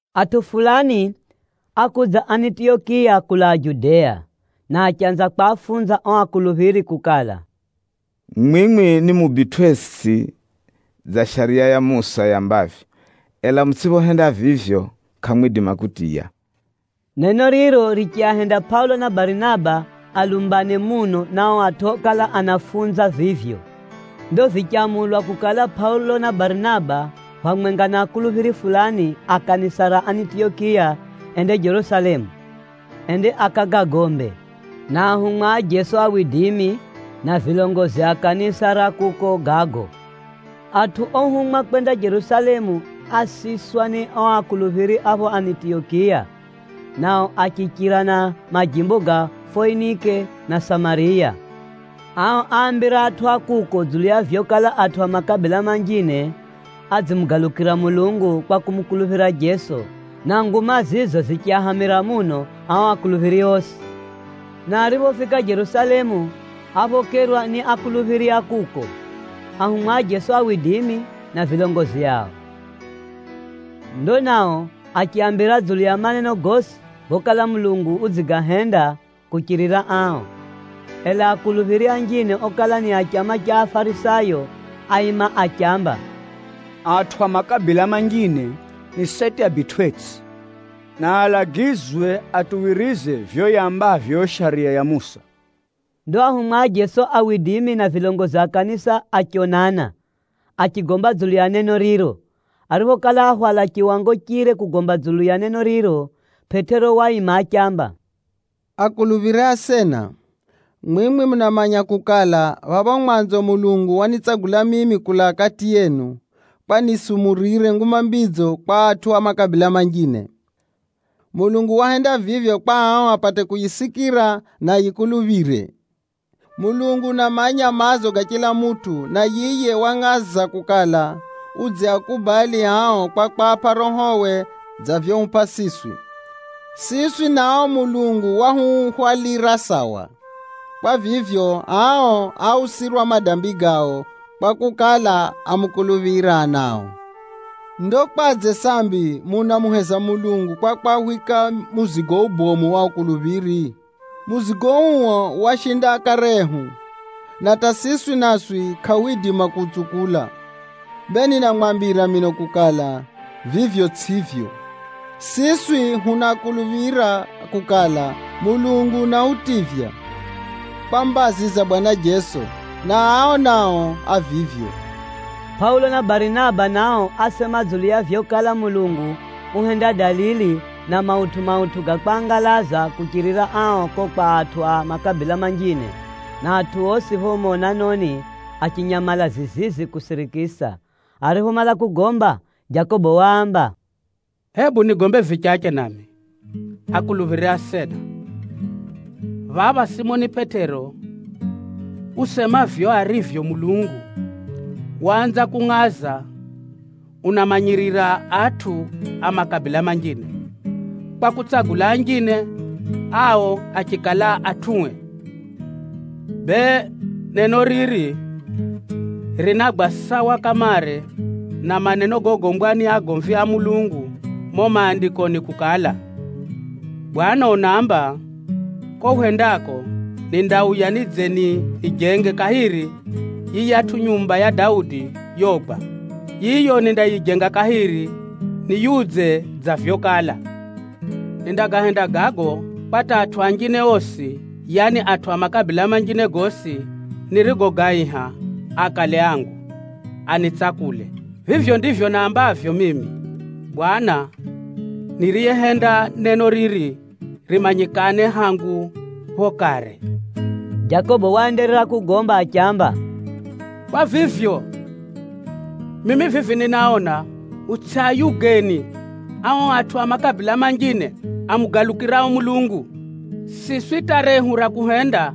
Atʼu fulani ákudza Anitiyokiya kulaa Judea, na achanza kwafunza o akuluphiri kukala, “Mwimwi nimubitʼwetsʼi dza Shariya ya Musa yambavyo. Ela mutsʼiphohenda vivyo, kʼamwidima kutiya.” Neno riro richiahenda Pʼaulo na Barinaba alumbane muno na o atʼu okala anafunza vivyo. Ndo vichamulwa kukala Pʼaulo na Barinaba, phamwenga na akuluphiri fulani a kanisa ra Anitiyokiya, ende Jerusalemu, ende akagagombe na ahumwa a Jeso, na vilongozi a kanisa ra kuko gago. Atʼu ohumwa kwenda Jerusalemu ásiswa ni o akuluphiri a pho Anitiyokiya, nao achichira na majimbo ga Foinike na Samariya. Ao áambira atʼu a kuko dzulu ya vyokala atʼu a makabila manjine adzimugalukira Mulungu kwa kumukuluphira Jeso, na nguma zizo zichiahamira muno ao akuluphiri osi. Na ariphofika Jerusalemu, áphokerwa ni akuluphiri a kuko, ahumwa a Jeso, na vilongozi ao. Ndo nao achiaambira dzulu ya maneno gosi gokala Mulungu udzigahenda kuchirira ao. Ela akuluphiri anjine okala ni a chama cha Afarisayo, áima achiamba, “Atʼu a makabila manjine ni seti abitwʼetsʼi, na alagizwe atuwirize vivyo yambavyo yo Shariya ya Musa.” Ndo ahumwa a Jeso na vilongozi a kanisa achionana, achigomba dzulu ya neno riro. Ariphokala áhwala chiwango chire kugomba dzulu ya neno riro, Pʼetero waima achiamba, “Akuluphiri asena, mwimwi munamanya kukala, phapho mwanzo Mulungu wanitsagula mimi kulaa kati yenu, kwa nisumurire Nguma Mbidzo kwa atʼu a makabila manjine. Mulungu wahenda vivyo kwa ao apate kuyisikira, na ayikuluphire. Mulungu unamanya maazo ga chila mutʼu, na yiye wangʼaza kukala, udziakubali ao kwa kwapʼa Rohowe dza vyohupʼa siswi. Siswi na ao Mulungu wahuhwalira sawa. Kwa vivyo, ao áusirwa madambi gao, kwakukala, ámukuluphira nao. Ndo kwadze sambi munamuheza Mulungu kwa kwahwika muzigo ubomu o anafunzi? Muzigo uo washinda akare ehu, na hata siswi naswi kʼahwidima kuutsukula. Bee ninamwambira mino kukala, vivyo tsʼivyo. Siswi hunakuluphira kukala, Mulungu unahutivya kwa mbazi za Bwana Jeso, na ao nao a vivyo.” Pʼaulo na Barinaba nao ásema dzulu ya vyokala Mulungu uhenda dalili na mautʼu-mautʼu ga kwangalaza kuchirira ao ko kwa atʼu a makabila manjine, na atʼu osi pho monanoni achinyamala zizizi kusirikisa. Ariphomala kugomba, Jakobo waamba, “Hebu nigombe vichache nami, akuluphiri asena! Phapha Simoni Pʼetero usema vivyo arivyo Mulungu waanza kungʼaza unaamanyirira atʼu a makabila manjine, kwa kutsagula anjine ao achikala atʼue. Bee, neno riri rinagwa sawa kamare na maneno gogombwa ni agomvi a Mulungu mumo Maandikoni kukala, ‘Bwana Mulungu unaamba, “Ko hwendako, nindauya nidze nijenge kahiri yiyatʼu nyumba ya Daudi yogwa. Yiyo nindayijenga kahiri niyiudze dza vyokala. Nindagahenda gago kwa hata atʼu anjine osi, yaani, atʼu a makabila manjine gosi nirigogaiha akale angu, anitsakule. Vivyo ndivyo naambavyo mimi Bwana Mulungu, niriyehenda neno riri rimanyikane hangu pho kare.”’” Jakobo waenderera kugomba achiamba, “Kwa vivyo, mimi vivi ninaona, hutsʼiayugeni ao atʼu a makabila manjine amugalukirao Mulungu. Siswi hata rehu ra kuhenda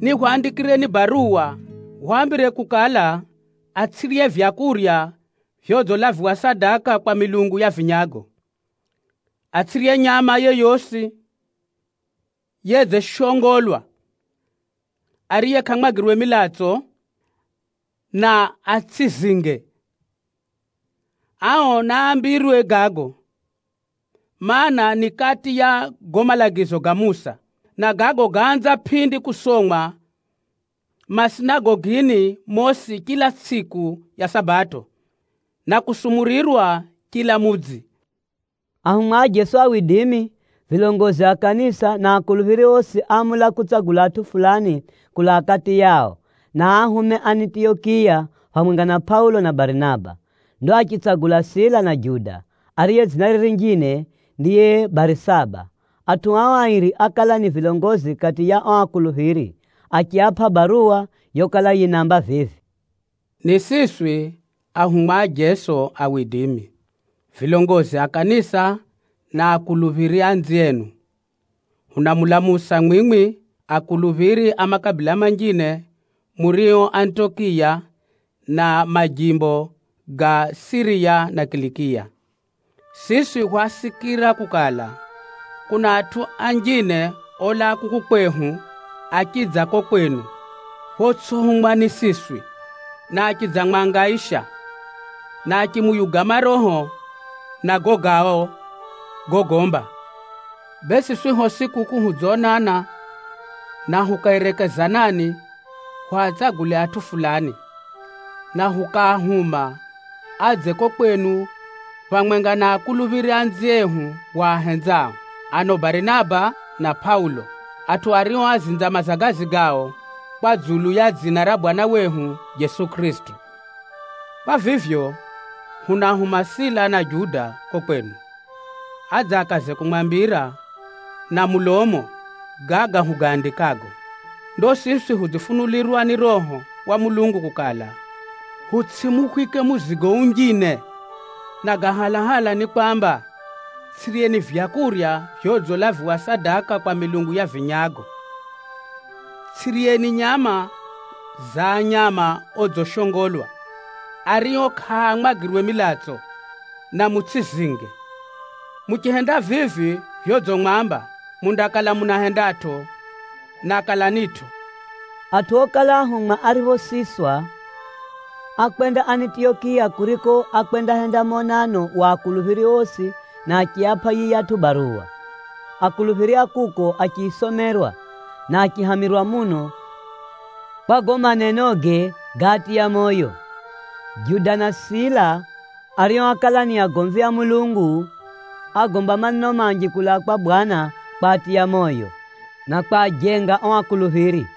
ni hwaandikireni baruwa hwaambire kukala, atsʼirye vyakurya vyodzilaviwa sadaka kwa milungu ya vinyago, atsʼirye nyama yeyosi yedzishongolwa, ariye kʼamwagirwe milatso, na atsʼizinge. Ao naambirwe gago, mana, ni kati ya gago malagizo ga Musa, na gago gáanza pʼindi kusomwa masinagogini mosi chila tsʼiku ya Sabato, na kusumurirwa chila mudzi.” Ahumwa a Jeso, vilongozi a kanisa na akuluphiri osi áamula kutsagula atʼu fulani kulaa kati yao, na aahume Anitiyokiya, phamwenga na Pʼaulo na Barinaba. Ndo achitsagula Sila na Juda, ariye dzinare rinjine ndiye Barisaba. Atʼu ao airi ákala ni vilongozi kati ya o akuluphiri. Achiapʼa baruwa yokala yinaamba vivi: “Ni siswi ahumwa a Jeso, vilongozi a kanisa na akuluphiri anzienu. Hunamulamusa mwimwi akuluphiri a makabila manjine murio Anitiyokiya, na majimbo ga Siriya na Kilikiya. Siswi hwasikira kukala, kuna atʼu anjine olaa kuku kwehu achidza ko kwenu photsʼihumwa ni siswi, na achidzamwangaisha, na achimuyuga maroho na gago gao gogomba. Bee siswi hosi kuku hudzonana, na hukaerekezanani hwatsagule atʼu fulani, na hukaahuma adze ko kwenu phamwenga na akuluphiri anziehu hwahenzao, ano Barinaba na Pʼaulo, atʼu ario ázinza mazagazi gao kwa dzulu ya dzina ra Bwana wehu Jeso Kʼirisito. Kwa vivyo, hunaahuma Sila na Juda ko kwenu, adze akaze kumwambira na mulomo gaga hugaandikago. Ndo siswi hudzifunulirwa ni Roho wa Mulungu kukala, hutsʼimuhwike muzigo unjine, na ga halahala ni kwamba: tsʼiryeni vyakurya vyodzilaviwa sadaka kwa milungu ya vinyago, tsʼiryeni nyama za nyama odzishongolwa, ario kʼaamwagirwe milatso, na mutsʼizinge. Muchihenda vivi vyodzimwamba, mundakala munahendatʼo, na kalanitʼo.” Atʼu okala ahumwa ariphosiswa, ákwenda Anitiyokiya kuriko ákwendahenda monano wa akuluphiri osi na achiapʼa yiyatʼu baruwa. Akuluphiri a kuko achiyisomerwa, na achihamirwa muno kwa gago manenoge gáatiya moyo. Juda na Sila, ario ákala ni agomvi a Mulungu, ágomba maneno manji kulaa kwa Bwana kwatiya moyo, na kwajenga o akuluphiri.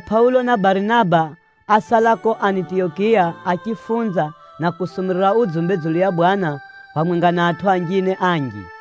Ela Pʼaulo na Barinaba ásala ko Anitiyokiya achifunza, na kusumurira udzumbe dzulu ya Bwana phamwenga na atʼu anjine anji.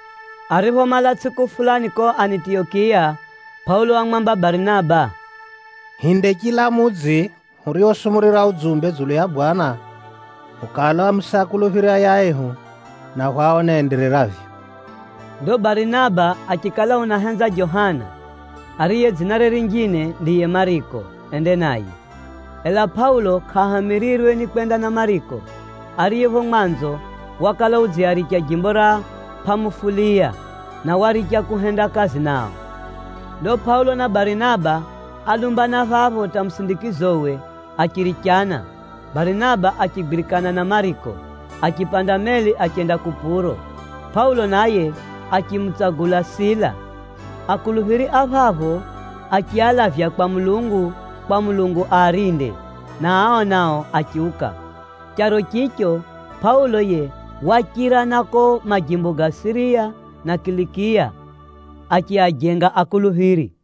Ariphomala tsʼiku fulani ko Anitiyokiya, Pʼaulo wamwamba Barinaba, “Hinde chila mudzi huriosumurira udzumbe dzulu ya Bwana, hukaalamuse akuluphiri ayaehu, na hwaone endereravyo.” Ndo Barinaba achikala unahenza Johana, ariye dzinare rinjine ndiye Mariko, ende naye. Ela Pʼaulo kʼahamirirwe ni kwenda na Mariko, ariye pho mwanzo wakala udziaricha jimbo ra Pʼamufuliya, na waricha kuhenda kazi nao. Ndo Pʼaulo na Barinaba álumbana phapho hata musindikizowe achirichana. Barinaba achigwirikana na Mariko, achipanda meli achenda Kupuro. Pʼaulo naye achimutsagula Sila. Akuluphiri a phapho achialavya kwa Mulungu kwa Mulungu aarinde, na ao nao achiuka. Charo chicho, Pʼaulo yiye wachira na ko majimbo ga Siriya na Kilikiya achiajenga akuluphiri.